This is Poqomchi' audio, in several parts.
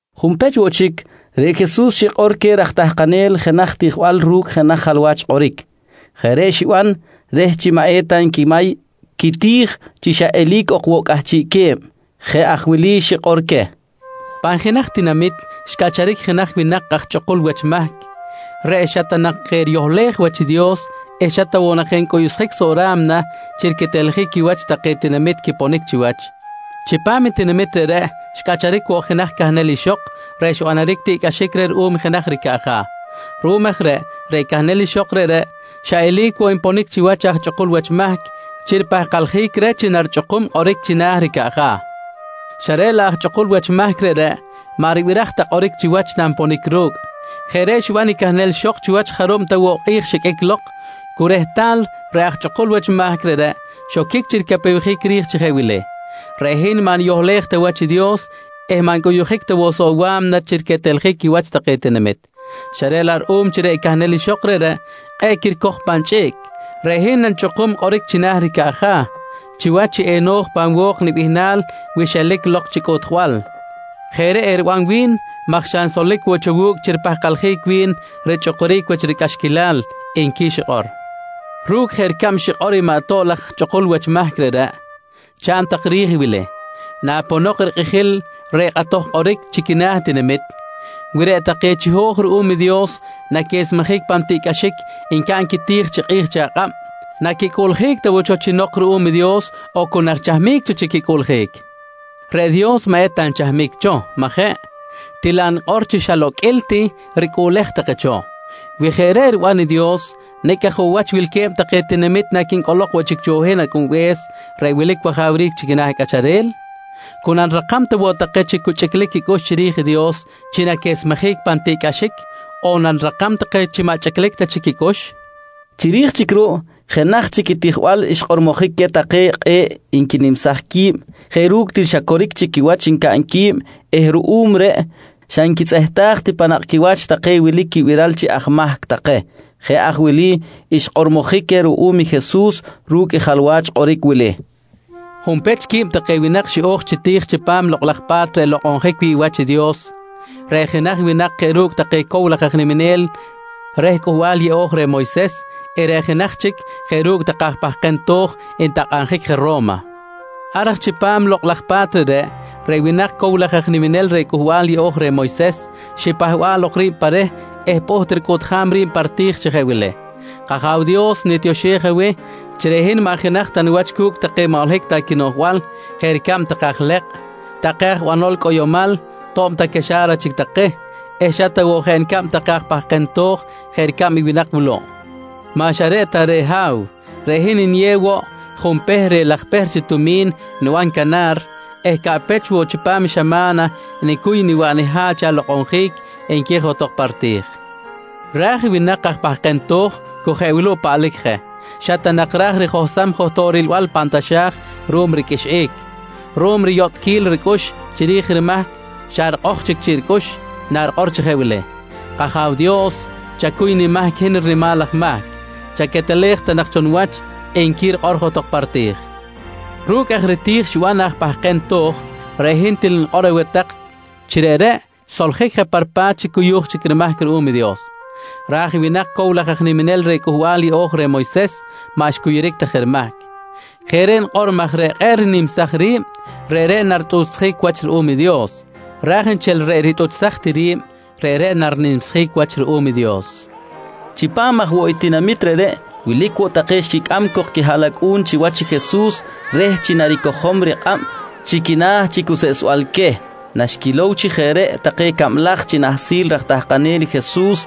Junpech woꞌ chic, reꞌ Jesus xikꞌor queh raj tahkanel jenaj tijbal ru̱cꞌ jenaj jalwach kꞌoric. Jeꞌ reꞌ xiban reh chi maꞌ eta nquimay quiti̱j chi xa eli̱c ok woꞌ cꞌahchiꞌque̱b. Jeꞌ aj wili xikꞌor queh: «Pan jenaj tinamit xcꞌacharic jenaj winak aj chꞌukul wach mahc reꞌ xa ta nak je riyohlej wach i Dios eh xa ta woꞌ ncꞌuyuꞌjic soꞌ ra̱mna chi riqueteljic quiwach take tinamit quiponic chiwach. Chipam i tinamit reꞌreꞌ xcꞌacharic woꞌ jenaj cahnel ixok reꞌ xbanaric tiꞌcꞌaxic reh ruꞌum jenaj ricaꞌja̱. Ruꞌum aj reꞌ, reꞌ cahnel ixok reꞌreꞌ xa eli̱c woꞌ nponic chiwach i aj chꞌukul wach mahc chi ripahkaljic reh chi narichꞌukum kꞌoric china̱ ricaꞌja̱, xa reꞌ laꞌ aj chꞌukul wach mahc reꞌreꞌ maꞌ ribiraj ta kꞌoric chiwach nanponic ru̱cꞌ. Jeꞌ reꞌ xiban i cahnel ixok chiwach jarub ta woꞌ kꞌi̱j xiqꞌuic lok, cu rehtal reꞌ aj chꞌukul wach mahc reꞌreꞌ xoquic chi ricapewjic ri̱j chi jeꞌ wili: ‹Reꞌ hin maꞌ niyohlej ta wach i Dios eh maꞌ ncꞌuyuꞌjic ta woꞌ soꞌ wa̱mna chi riqueteljic quiwach take tinamit, xa reꞌ laꞌ ruꞌum chi reꞌ cahnel ixok reꞌreꞌ kꞌe̱ꞌ quiricoj pan chꞌiꞌc, reꞌ hin nanichꞌukum kꞌoric china̱ ricaꞌja̱ chiwach chi eno̱j pan wo̱k i nibihnal wi xelic lok chi cꞌuꞌtjbal. Jeꞌ reꞌ eriban wi̱n maj xa nsolic woꞌ cho wu̱cꞌ chi ripahkaljic wi̱n richꞌukuric wach ricꞌaxquilal, nqui xikꞌor. «Ru̱cꞌ jeꞌ ricab xikꞌor i maꞌ ato̱b ta laj chꞌukul wach mahc reꞌreꞌ chaꞌn tak ri̱j i wili: Naponok rikꞌijil reh kꞌatoj kꞌoric chi quina̱ i tinamit, wi reꞌ take chiho̱j ruꞌum Dios chi naquesmejic pan tiꞌcꞌaxic ncaꞌn quiti̱j chi kꞌi̱j chi akꞌab, naquicꞌuꞌljic ta woꞌ cho chi nok ruꞌum i Dios on cu narichahmic cho chi quicꞌuꞌljic? Reꞌ Dios maꞌ eta nchahmic cho, majeꞌ? Til laꞌ nikꞌor chi xa loqꞌuil ti ricꞌuꞌlej take cho. Wi jeꞌ aj reꞌ riban i Dios, nicꞌ aj woꞌ wach wilque̱b take tinamit naquincꞌolok woꞌ chic cho hin Acꞌunbe̱s reꞌ wilic wajawric chi quina̱ cꞌacharel? Cu nanirakam ta woꞌ take chi cu chꞌiclic quicꞌux chiri̱j i Dios chi naquesmejic pan tiꞌcꞌaxic, on nanirakam take chi maꞌ chꞌiclic ta chic quicꞌux? nqui Jesus queh. Chiri̱j chic ruꞌ jenaj chic i tijbal xkꞌormojic queh take kꞌe̱ꞌ nquinimsaj qui̱b jeꞌ ru̱cꞌ til xa coric chic quiwach ncaꞌn qui̱b eh ruꞌum reꞌ xa nquitzꞌehtaj ti pan nakꞌ quiwach take wilic quibiral chi aj mahc take. Jeꞌ aj wili xkꞌormojic queh ruꞌum i Jesus ru̱cꞌ i jalwach kꞌoric wili: «Junpech, quib take winak xiꞌo̱j chi ti̱j chipam Lokꞌ laj Pa̱t reꞌ nlokꞌonjic wi̱ꞌ wach i Dios. Reꞌ jenaj winak jeꞌ ru̱cꞌ take cow laj aj niminel reh Cꞌuhbal Yeꞌo̱j reh Moyses eh reꞌ jenaj chic jeꞌ ru̱cꞌ take aj pahkem to̱j ntakꞌabjic je Ro̱ma. Ar aj chipam lokꞌ laj pa̱t reꞌreꞌ, reꞌ winak cow laj aj niminel reh Cꞌuhbal Yeꞌo̱j reh Moyses xipahba̱ꞌ lok ri̱b pa reh eh pꞌuht ricꞌuꞌtjam ri̱b pa riti̱j chi jeꞌ wili: ‹K-Aja̱w Dios, nitioxej aweh chi reꞌ hin maꞌ jenaj ta niwach cu̱cꞌ take maꞌ holohic ta quinoꞌjbal, jeꞌ ricab take aj lekꞌ, take aj banol cꞌoyomal to̱b ta caxa̱ra chic take eh xa ta woꞌ jeꞌ nicab take aj pahkem to̱j jeꞌ ricab i winak wuluꞌ. Maꞌ xa reꞌ ta reꞌ Ha̱w, reꞌ hin niyew woꞌ junpehr reh laj pehr chi tumi̱n niban canar eh caꞌpech woꞌ chipam xama̱na nicuy niwaꞌ niha̱ꞌ chi alokꞌonjic, nqui johtok pa riti̱j. «Ra̱j i winak aj pahkem to̱j cu jeꞌ wuluꞌ paꞌlic je. Xa ta nak ra̱j rijohsam johtok rilbal pan taxa̱j ruꞌum riqꞌuixꞌic. Ruꞌum riyotꞌquil ricꞌux chiri̱j rimahc xa rikꞌoj chic chiꞌ ricꞌux narikꞌor chi jeꞌ wili: ‹K-Aja̱w Dios, chacuy nimahc i hin rinimal aj mahc. Chaquetelej ta nak cho niwach, nqui rikꞌor johtok pa riti̱j. «Ru̱cꞌ aj riti̱j xiban aj pahkem to̱j reꞌ hin til nikꞌor aweh tak chi reꞌreꞌ xsoljic je pa ripa̱t chi cuyu̱j chic rimahc ruꞌum Dios. Ra̱j i winak cow laj aj niminel reh Cꞌuhbal Yeꞌo̱j reh Moyses maꞌ xcuyuric ta je rimahc. Jeꞌ reꞌ nikꞌor maj reꞌ kꞌe̱ꞌ rinimsaj ri̱b, reꞌreꞌ naritꞌuchsjic wach ruꞌum i Dios ra̱j nchel reꞌ ritꞌuchsaj ti ri̱b, reꞌreꞌ narinimsjic wach ruꞌum i Dios, nqui Jesus queh. Chipam aj woꞌ i tinamit reꞌreꞌ wilic woꞌ take xquicꞌam cok quihaꞌlacꞌu̱n chiwach i Jesus reh chi naricojom rikꞌab chi quina̱ chi cuseꞌsbal queh. Naxquilow chi jeꞌ reꞌ take cablaj chi nahsil raj tahkanel i Jesus,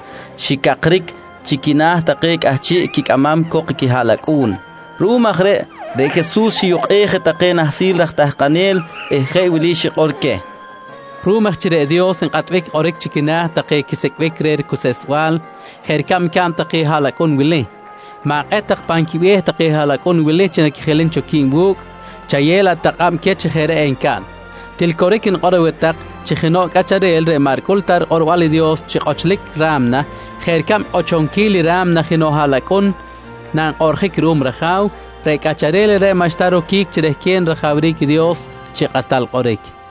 xicakric chi quina̱ take cꞌahchiꞌ quicꞌamam cok i quihaꞌlacꞌu̱n. Ruꞌum aj reꞌ, reꞌ Jesus xiyukꞌej je take nahsil raj tahkanel eh jeꞌ wili xikꞌor queh: «Ruꞌum aj chi reꞌ Dios nkꞌatbic kꞌoric chi quina̱ take quisicꞌbic reh ricuseꞌsbal jeꞌ ricab ncaꞌn take haꞌlacꞌun wili, ma̱kꞌet tak pan quibe̱h take haꞌlacꞌun wili chi naquijilim cho qui̱b wu̱cꞌ, chayew laꞌ tak kꞌab queh chi jeꞌ reꞌ encaꞌn. Til coric nikꞌor aweh tak chi jenoꞌ cꞌacharel reꞌ maꞌ ricꞌul ta rikꞌorbal i Dios chi kꞌochlic ra̱mna jeꞌ ricab kꞌochonquil i ra̱mna jenoꞌ haꞌlacꞌun nankꞌoꞌrjic ruꞌum raja̱w, reꞌ cꞌacharel reꞌreꞌ maꞌxta roquic chi rehquen rajawric i Dios chi kꞌatal kꞌoric, nqui xikꞌor queh.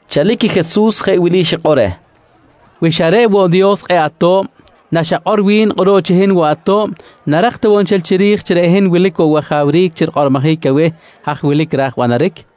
Chalic i Jesus jeꞌ wili xikꞌor reh: «Wi xa reꞌ woꞌ Dios kꞌe̱ꞌ ato̱b, naxakꞌor wi̱n kꞌuruꞌ chi hin woꞌ ato̱b, narak ta woꞌ nchel chiri̱j chi reꞌ hin wilic woꞌ wajawric chi rikꞌormojic aweh haj wilic ra̱j banaric? nqui reh.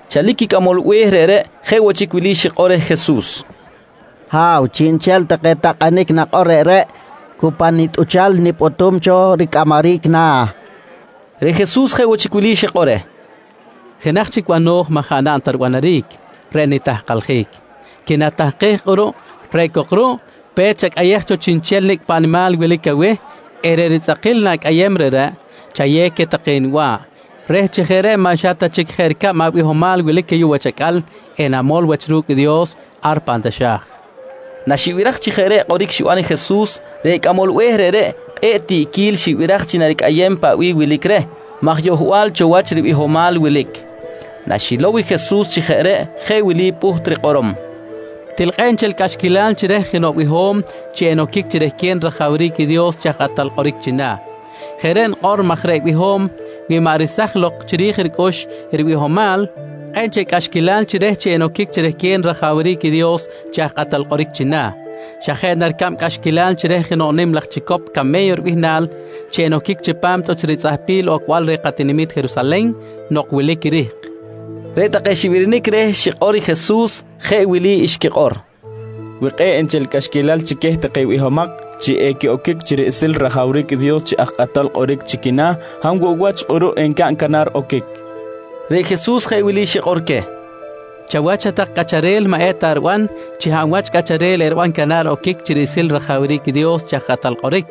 Chalic i cꞌamol be̱h reꞌreꞌ jeꞌ woꞌ wili xikꞌor reh Jesus: «Ha̱w, chiꞌnchel take takꞌanic nakꞌor reꞌreꞌ cu pa nitꞌuchal nipꞌutum cho ricꞌamaric na̱, nqui reh. Reꞌ Jesus jeꞌ woꞌ chic wili xikꞌor reh: «Jenaj chic bano̱j maꞌ jaꞌ naꞌn ta ribanaric, reꞌ nitahkaljic. Quinatahkej kꞌuruꞌ reꞌ cok ruꞌ, pe̱t chacꞌayej cho chiꞌnchel nicꞌ paꞌ nimal wilic aweh eh reꞌ ritzꞌakil na̱cꞌayem reꞌreꞌ, chayew queh take niba̱ꞌ reh chi jeꞌ reꞌ maꞌ xa ta jeꞌ chic ricab abihomal wilic ayuꞌ wach acꞌal enamol wach ru̱cꞌ i Dios ar pan taxa̱j, nqui Jesus reh. Naxibiraj chi jeꞌ reꞌ kꞌoric xiban i Jesus, reꞌ cꞌamol be̱h reꞌreꞌ kꞌe̱ꞌ tiꞌquil xibiraj chi naricꞌayem paꞌ bih wilic reh maj yohbal cho wach ribihomal wilic. Naxilow i Jesus chi jeꞌ reꞌ, jeꞌ wili pꞌuht rikꞌorom: «Til kꞌe̱ꞌ nchel cꞌaxquilal chi reh jenoꞌ biho̱m chi enoquic chi rehquen rajawric i Dios chi aj kꞌatal kꞌoric china̱! Jeꞌ reꞌ nikꞌor maj reꞌ biho̱m wi maꞌ resaj lok chi rij ricꞌux i ribihomal, kꞌe̱ꞌ nchel cꞌaxquilal chi reh chi enoquic chi rehquen rajawric i Dios chi aj kꞌatal kꞌoric china̱. Xa jeꞌ na ricab cꞌaxquilal chi reh jenoꞌ nim laj chicop came̱yo ribihnal, chi enoquic chipam tꞌuch ritzꞌahpil ocbal reh katinami̱t Jerusalen nok wilic i rihk, nqui Jesus. Reꞌ take xibirinic reh xikꞌor i Jesus jeꞌ wili xquikꞌor: «Wi kꞌe̱ꞌ nchel cꞌaxquilal chi queh take bihomak chi equiꞌoquic chi riꞌsil rajawric i Dios chi aj kꞌatal kꞌoric chi quina̱, hab woꞌ wach kꞌuruꞌ encaꞌn canar oquic? nqui take. Reꞌ Jesus jeꞌ wili xikꞌor queh: «Chawach hat-tak cꞌacharel maꞌ eta riban chi hab wach cꞌacharel eriban canar oquic chi riꞌsil rajawric i Dios chi aj kꞌatal kꞌoric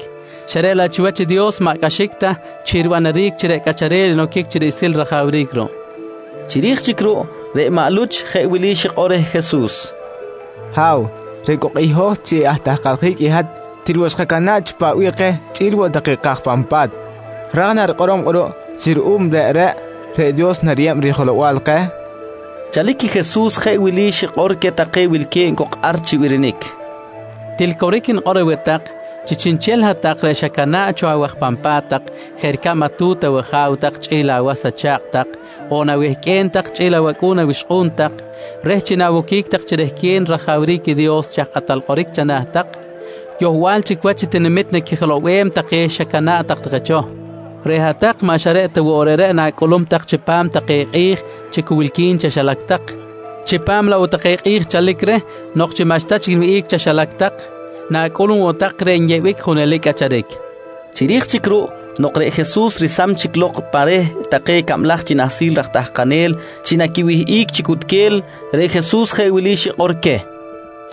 xa reꞌ laꞌ chiwach i Dios maꞌ cꞌaxic ta chi ribanaric chi reꞌ cꞌacharel enoquic chi riꞌsil rajawric ruꞌ, nqui Jesus. Chiri̱j chic ruꞌ, reꞌ maꞌ Luch jeꞌ wili xikꞌor reh Jesus: «Ha̱w, reꞌ cok i hoj chi atahkaljic i hat til woꞌ xkacana̱ꞌ cho paꞌ bih keh chꞌi̱l woꞌ take kaj pan pa̱t. Ra̱j na rikꞌorom kꞌuruꞌ chi ruꞌum reꞌreꞌ, reꞌ Dios nariyeb rijelow-bal keh? nqui reh Jesus. Chalic i Jesus jeꞌ wili xikꞌor queh take wilque̱b cok ar chi birinic: «Til coric nikꞌor aweh tak chi chiꞌnchel hat-tak reꞌ xacana̱ꞌ cho awaj pan pa̱t tak jeꞌ ricab atu̱t awaja̱w tak chꞌi̱l awas acha̱kꞌ tak on awehqꞌue̱n tak chꞌi̱l awacꞌu̱n awixkꞌu̱n tak, reh chi nawoquic tak chi rehquen rajawric i Dios chi aj kꞌatal kꞌoric chana̱ tak, yohbal chic wach tinamit naquijilow-bem take xacana̱ꞌ tak take cho. Reꞌ hat-tak maꞌ xa reꞌ ta woꞌ reꞌreꞌ na̱cꞌulum tak chipam take kꞌi̱j chi cu wilqui̱n chaxilac tak, chipam laꞌ woꞌ take kꞌi̱j chalic reh nok chi maꞌxta chic niwihꞌic chaxilac tak, na̱cꞌulum woꞌ tak reꞌ nyeꞌbic i junelic cꞌacharic, nqui queh. Chiri̱j chic ruꞌ nok reꞌ Jesus resam chic lok pa reh take cablaj chi nahsil raj tahkanel chi naquiwihꞌic chi cutquel, reꞌ Jesus jeꞌ wili xikꞌor queh: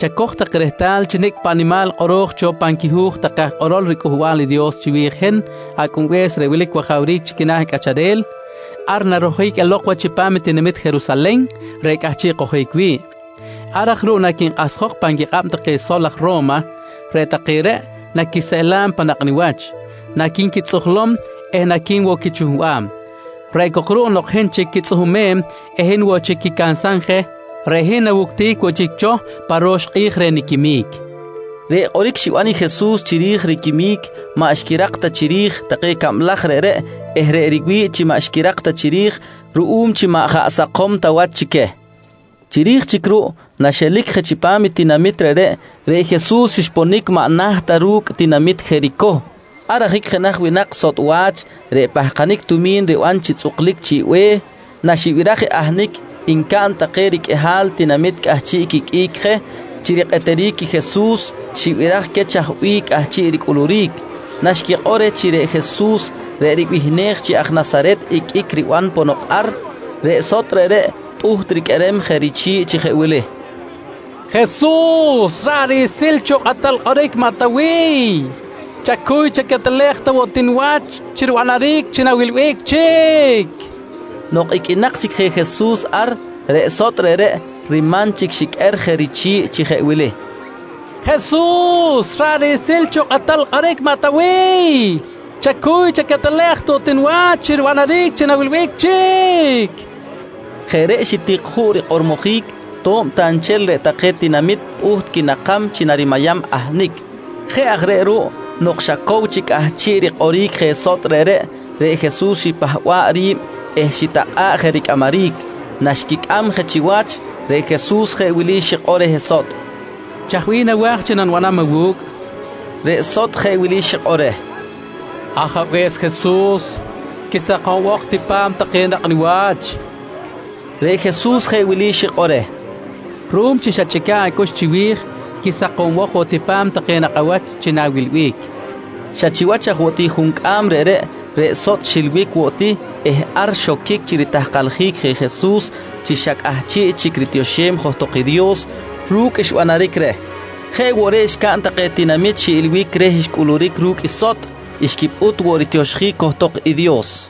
«Chacoj tak rehtal chi nicꞌ paꞌ nimal kꞌoro̱j cho pan quihu̱j take aj kꞌorol riCꞌuhbal i Dios chiwi̱j i hin Acꞌunbe̱s reꞌ wilic wajawric chi quina̱ cꞌacharel, ar narojic elok wach chipam i tinamit Jerusalen reꞌ cꞌahchiꞌ kojic wi̱ꞌ. Ar aj ruꞌ naquinkꞌahsjok pan quikꞌab take sol aj Ro̱ma, reꞌ take reꞌ naquiseꞌlam pan nakꞌ niwach, naqui̱nquitzꞌujlom eh naqui̱n woꞌ quichuhbam. Reꞌ cok ruꞌ nok hin chic quitzꞌuhumem eh hin woꞌ chic quicansam je, reꞌ hin nawuctic woꞌ chic cho pa ro̱x kꞌi̱j reh niquimic, nqui Jesus queh. Reꞌ kꞌoric xiban i Jesus chiri̱j riquimic, maꞌ xquirak ta chiri̱j take cablaj reꞌreꞌ eh reꞌ riwi̱ꞌ chi maꞌ xquirak ta chiri̱j ruꞌum chi maꞌ jaꞌ sakom ta wach chi queh. Chiri̱j chic ruꞌ naxelic je chipam i tinamit reꞌreꞌ, reꞌ Jesus xponic maꞌ naht ta ru̱cꞌ tinamit Jericoh. Ar ajic jenaj winak sotꞌ wach reꞌ pahkanic tumi̱n riban chi tzꞌuklic chi̱ꞌ be̱h, naxibiraj i ahnic ncaꞌn take riqꞌuihal tinamit cꞌahchiꞌ quiqꞌuic je chi rikꞌeteric i Jesus, xibiraj queh chaj bih cꞌahchiꞌ ricꞌuluric. Naxquikꞌor reh chi reꞌ Jesus reꞌ ribihnej chi aj Nasaret iqꞌuic riban ponok ar, reꞌ sotꞌ reꞌreꞌ pꞌuht riqꞌuerem je richi̱ꞌ chi jeꞌ wili: «Jesus ra̱ꞌ riꞌsil cho kꞌatal kꞌoric maꞌ Tawiy, chacuy chaquetelej ta woꞌ ti niwach chi ribanaric chi na̱wilbic chic, nqui je reh. Nok iqꞌuinak chic je Jesus ar, reꞌ sotꞌ reꞌreꞌ riman chic xiqꞌuer je richi̱ꞌ chi jeꞌ wili: «Jesus ra̱ꞌ riꞌsil cho kꞌatal kꞌoric maꞌ Tawiy, chacuy chaquetelej ta woꞌ ti niwach chi ribanaric chi na̱wilbic chic, nqui pꞌuht rikꞌorom je. Jeꞌ reꞌ xitik juꞌ rikꞌormojic to̱b ta nchel reꞌ take tinamit pꞌuht quinakam chi narimayam ahnic. Jeꞌ aj reꞌ ruꞌ nok xa cow chic cꞌahchiꞌ rikꞌoric je sotꞌ reꞌreꞌ, reꞌ Jesus xipahba̱ꞌ ri̱b eh xitakꞌa̱ꞌ je ricꞌamaric. Naxquicꞌam je chiwach, reꞌ Jesus jeꞌ wili xikꞌor reh sotꞌ: «Chaj bih nawa̱j chi nanibanam awu̱cꞌ? nqui reh. Reꞌ sotꞌ jeꞌ wili xikꞌor reh: «Ajabe̱s Jesus, quisakombok ti pa̱m take nakꞌ niwach, nqui reh. Reꞌ Jesus jeꞌ wili xikꞌor reh: «Ruꞌum chi xachꞌica̱ꞌ acꞌux chiwi̱j, quisokombok woꞌ ti pa̱m take nakꞌ awach chi na̱wilbic, nqui reh. Xa chiwach aj woꞌ ti juncꞌam reꞌreꞌ, reꞌ sotꞌ xilbic woꞌ ti eh ar xoquic chi ritahkaljic je Jesus chi xa cꞌahchiꞌ chic ritioxem johtok i Dios ru̱cꞌ xbanaric reh. Jeꞌ woꞌ reꞌ xcaꞌn take tinamit xiꞌilbic reh xcꞌuluric ru̱cꞌ i sotꞌ, xquipꞌut woꞌ ritioxjic johtok i Dios.